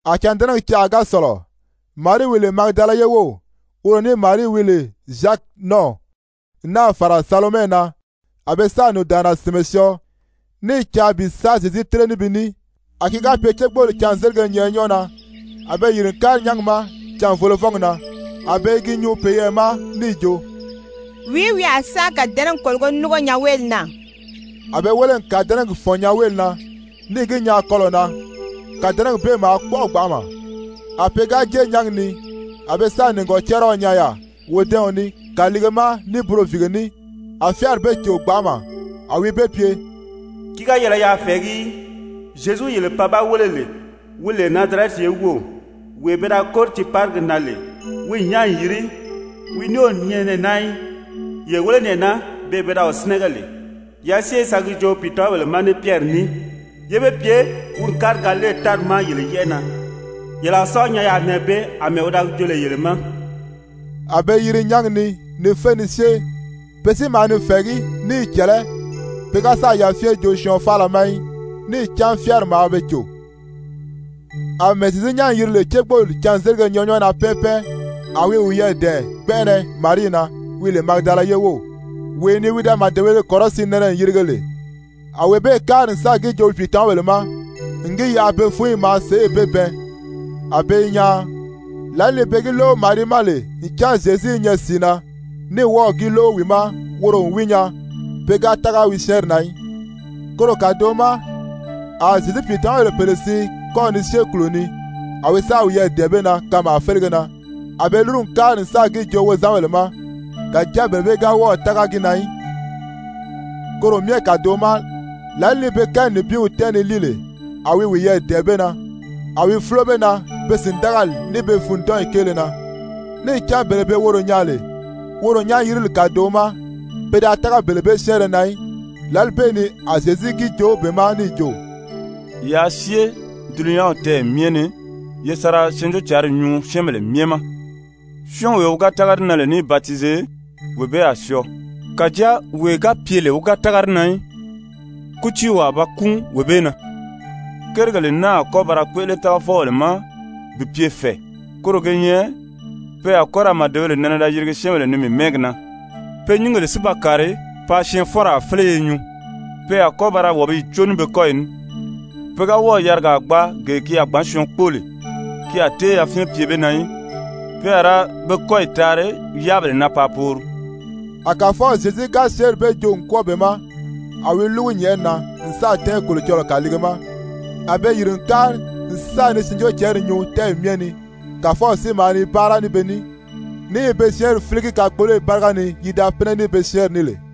A cândɛnɛgi canʔa ga sɔ̀lɔ, Marii wi lè Magidala ye wów, woro ní Marii wi lè Zyaki nɔ́ɔw, n náà fàra Salomɛ na, a be sáà nùndaanna sìnmɛ syɔɔ, ní i caa bi sa Zyezu tíre ní bi ní. A ki ga pye cégbooli cânzelige nyɛʔɛ nyɔ́ɔ na, a be yìri n kári nyángi ma canvolovɔ́ngi na. A be i gi nyuu peyɛɛ ma níì jo: «Wìí wi a sa kàdɛnɛgi kòlogo núngo nyanweeli na?» A be wéle n kàdɛnɛgi fɔ̀n nyanweeli na níì gi nyaa kɔlɔ̀ na, kàdɛnɛgi bee maa kpɔ́ʔɔ gbanʔama. A pe ga jée nyángi ni, a be nìgɔcariɔ nyaa yaà wodɛ́ɛɔn ní kàliige ma ní buroviige ní, a fyáari be cò gbanʔama. A wi be pye: «Ki ga yɛlɛ yaa fɛ̀ɛgí í, Zyezu yele pan ba wéle lè, wi lè Nazarɛti ye wów, wee pe da kóri tiiparigi na lè, wi n nyán n yiri, wi ní o nyɛ nɛɛ naa í. Ye wéle nɛɛ naa, beè pe da wi sínɛgɛ lè. Yaa syée ye sa gi joo wi pìitamabèle ma ní Pyɛri ní, yé be pye wi n kári Galile tári ma yele yɛ́ʔɛ na, yele a sa wi nyaa yaà nɛɛ bee, àmɛɛ wi da gi joo lè yele ma.» A be yiri nyángi ni ni fé ni syée, pe si maa ni fɛ̀ɛgí ní i cɛ̀lɛ́, pe ga sáà yafyɛn joo syɔɔn faala ma í, níì cán fyáari maa be cò. [Amɛɛ Zyezu nyán n yiri lè cégbooli cânzelige nyɛʔɛ nyɔ́ɔ na pɛ́ɛn pɛ́ɛn, a wi wiyɛɛ dɛ̀ɛn gbɛnʔɛnɛ Marii na, wi lè Magidala ye wów, wee ni wi da màdebēle kɔrɔsiin nɛnɛ n yirige lè. A wee bee kári n sáà gi joo wi pìitamabèle ma n gi yaʔa be fúnyi maa sèʔê be bɛɛn, a be i nyaan. Lǎli ni be gi lóʔo Marii ma lè ncan Zyezu i nyɛ sìi na, ní wɔ́ɔ̀ gi lóʔo wi ma woro n wi nyaa, pe ga tága wi syɛ́ɛnri na í. Koro kàdoʔo ma a Zyezu pìitamabèle pèle siin kɔ́ ni syée kùlo ni, a wi sáà wiyɛɛ dɛ̀ɛn be na kanmaa félege na. A be lúru n kári n sáà gi joo wozanbèle ma, kàjáa bele bee ga wɔ́ɔ̀ tága gi na í. Koro myɛ kàdoʔo ma, lǎli ni pe kɛɛ ní nibinw tɛ́ɛn ni líi lè, a wi wiyɛɛ dɛ̀ɛn be na, a wi fúlo be na be sìndagali ní be fûndɔnyi kéele na, níì cán bele be woro nyaa lè woro nyán-yirili kàdoʔo ma, pe da tága bele bee syɛ́ɛnrɛ na í. Lǎli bee ni a Zyezu gi joo be ma níì jo: «Yaa syée dulunyanw tɛ́ɛyɛ myɛ ni ye sa ra Syɛɛnjóocǎnri nyuu syɛ́ɛnbèle myɛ ma. Syɔ́ɔnwee wi ga tága di na lè níì batize, wee bee a syɔɔ, kàjáa wee ga pye lè wi ga tága di na í, kútiiw a ba kúun wee bee na. Kérigèle naa a kɔ́ ba ra kpéʔele tágafɔbèle ma bi pye fɛ̀ɛ, koro ge nyɛ: pe a kɔ́ ra màdebèle nɛnɛ da yirigi syɛ́ɛnbèle ni mii mɛ́ɛgi na, pe nyíngèle si ba kàri paa syɛɛnfɔ́nraa féleye nyuu. Pe a kɔ́ ba ra wàbiyi có ní be kɔ́yi ní. Pe ga wɔ́ɔ̀ yarigaa gbaa gee ki a gbǎn syɔɔn kpóo lè, ki a tée yafyɛn pye be na í. Pe a ra be kɔ́yi taari yáabèle na paa poori.» A Kàfɔw Zyezu ga syɛ́ɛnri bee joo n kwɔ́ɔ be ma, a wi lúgu nyɛ̀ʔɛni na n sáà tɛ́ɛn Kolocɔlɔɔ kàliige ma. A be yìri n kári n sa ni Syɛɛnjóocǎnri nyuu tɛ́ɛyi myɛ ni. Kàfɔw si maa ni báara ní be ní, ní i be syɛ́ɛnri fíligi kakpoloyi báriga ni yi da pínɛ ní be syɛ́ɛnri ní lè.]